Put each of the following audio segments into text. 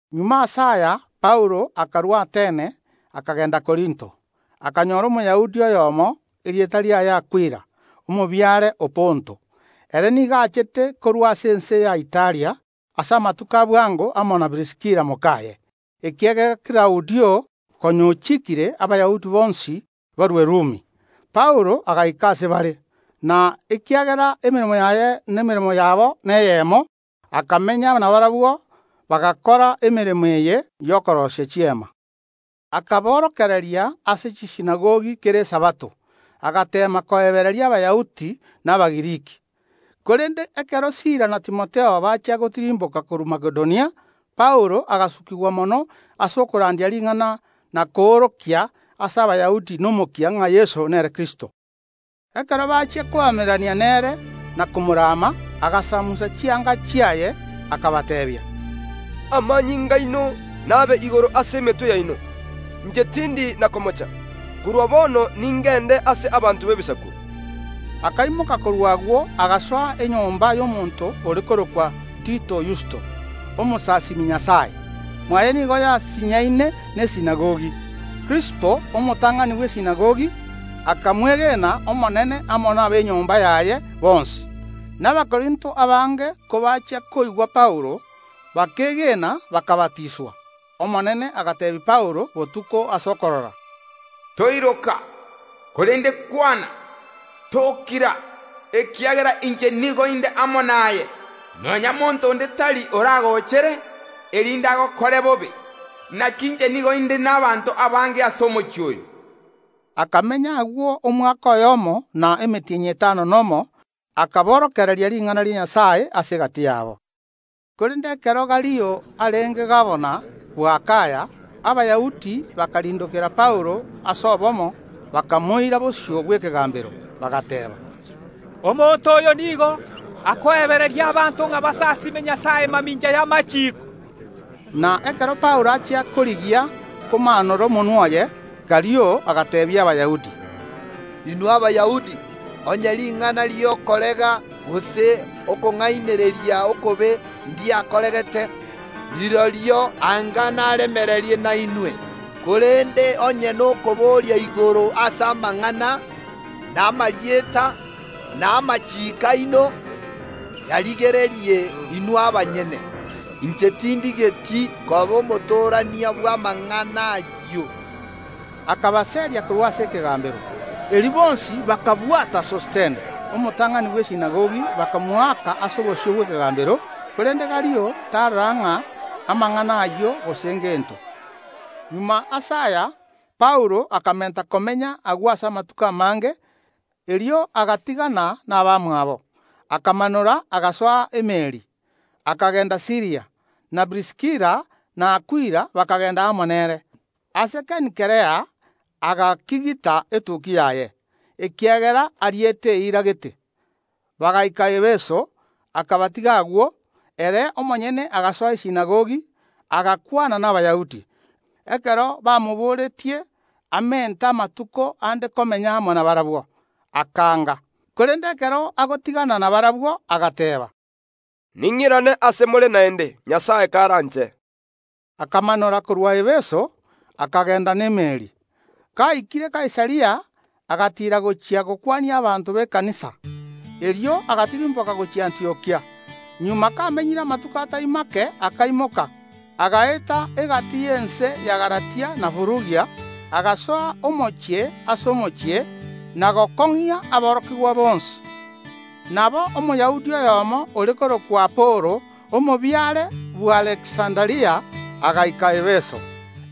Magega ase aya Paulo akarua Atene, akagenda Korinto. Akanyora Omoyahudi oyomo, erieta riaye Akwila, omobiare o Ponto. Ere nigo achete korwa ase ense ya Italia ase amatuko a bwango amo na Priskila mokaye, ekiagera Klaudio konya ochiikire Abayahudi bonsi barue Rumi. Paulo agaika ase bare, na ekiagera emeremo yaye na emeremo yabo neyemo, akamenya nabarabwo, bagakora emeremo eye y’okoroisia chiema. Akaborokereria ase chisinagogi kera Esabato, agateema koebereria Abayahudi na Abagiriki. Korende ekero Sila na Timotheo bachia gotirimboka korwa Makedonia, Paulo agasukigwa mono ase okorandia ring’ana na koorokia ase Abayahudi nomokia ng’a Yeso nere Kristo. Ekero bachia koamererania nere na komorama, agasamusa chianga chiaye, akabateebia: “Amanyinga aino nabe igoro ase emetwe yaino! Inche tindi na komocha. Korwa bono ningende ase abanto b’Ebisaku.” Akaimoka korwa agwo, agasoa enyomba y’omonto ore korokwa Tito Yusto, omosasiimi Nyasae. Mwaye nigo yasinyaine nesinagogi. Krispo, omotang’ani bw’esinagogi, akamwege n’Omonene amo nab’enyomba yaye bonsi; na Abakorinto abange kobachia koigwa Paulo, bakeegena, bakabatiswa. Omonene agateebia Paulo botuko ase okorora: “Toiroka, korende kwana, tokira, ekiagera inche nigo inde amo naye, nonya monto onde tari oragoochere, erinde agokore bobe. Naki inche nigo inde n’abanto abange ase omochie oyo.” Akamenya agwo omwaka oyomo na emetienyi etano nomo, akoborokereria ring’ana ria Nyasae ase egati yabo. Korende ekero Galio arenge gabana bw’Akaya, Abayahudi bakarindokera Paulo ase obomo, bakamoira bosio bw’ekegambero, bagateeba: “Omonto oyo nigo akoebereria abanto ng’a basasiime Nyasae mamincha y’amachiiko.” Na ekero Paulo achia korigia komaanora omonwa oye, Galio agateebia Abayahudi: “Inwe Abayahudi, onye ring’ana ri’okorega gose okong’ainereria okobe ndiakoregete, rirorio anga naremereria nainwe, korende onye nokoboria igoro ase amang’ana, na amarieta, na amachiiko aino, yarigererie inwe abanyene. Inche tindigeti koba omotorania bw’amang’ana ayio.” Akabaseria korwa ase ekegambero. Erio bonsi bakabwata Sostene, omotang’ani bw’esinagogi, bakamoaka ase obosio bw’ekegambero. Korende Galio tarora ng’a amang’ana ayio gose ngento. Magega ase aya Paulo akamenta komenya agwo amatuko amange, erio agatigana nabamwabo, akamanora agasoa emeeri, akagenda Siiria, na Priskila na Akwila bakagenda amo nere. Ase Kenkrea agakigita etukia yaye, ekiagera ariete eira gete. Bagaika Efeso, akabatiga agwo; ere omonyene agasoa esinagogi, agakwana n’Abayahudi. Ekero bamoboretie amente amatuko ande komenya amo nabarabwo, akaanga. Korende ekero agotigana nabarabwo agateeba: “Ning’irane ase more naende, Nyasae karanche.” Akamanora korwa Efeso, akagenda n’emeeri. Gaikire Kaisaria, agatiira gochia gokwania abanto b’ekanisa. Erio agatirimboka gochia Antiokia. Magega kamenyire amatuko atai make akaimoka, agaeta egati y’ense ya Galatia na Furugia, agasoa omochie ase omochie, na gokong’ia aborokigwa bonsi. Nabo Omoyahudi oyomo, ore korokwa Apolo, omobiare bw’Aleksanderia, agaika Efeso.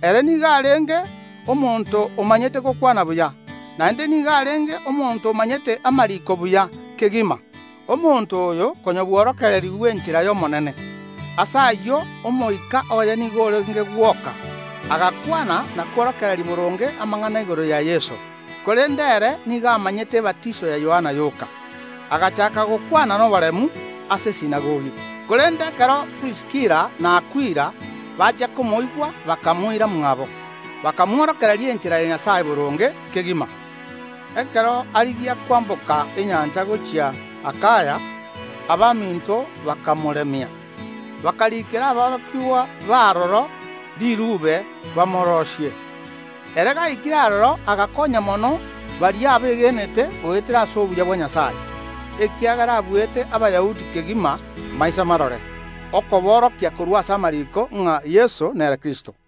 Ere nigo arenge omonto omanyete gokwana buya, naende nigo arenge omonto omanyete amariiko buya kegima. Omonto oyo konya bworokererigwe enchera y’Omonene. Ase ayio omoika oye nigo orenge gwoka, agakwana na kworokereria boronge amang’ana igoro ya Yeso, korende ere nigo amanyete ebatiso ya Yohana yoka. Agachaaka gokwana noboremu ase esinagogi. Korende ekero Priskila na Akwila bachia komoigwa bakamoira mwabo, bakamworokia enchera ya Nyasae boronge kegima. Ekero arigia kwamboka enyancha gochia Akaya, abaminto bakamoremia, bakariikera aborokigwa b’aroro riruube bamoroisie. Ere gaikire aroro agakonya mono baria abegenete goetera ase obuya bwa Nyasae, ekiagera abuete Abayahudi kegima maiso marore, okoborokia korwa ase amariiko ng’a Yeso nere Kristo.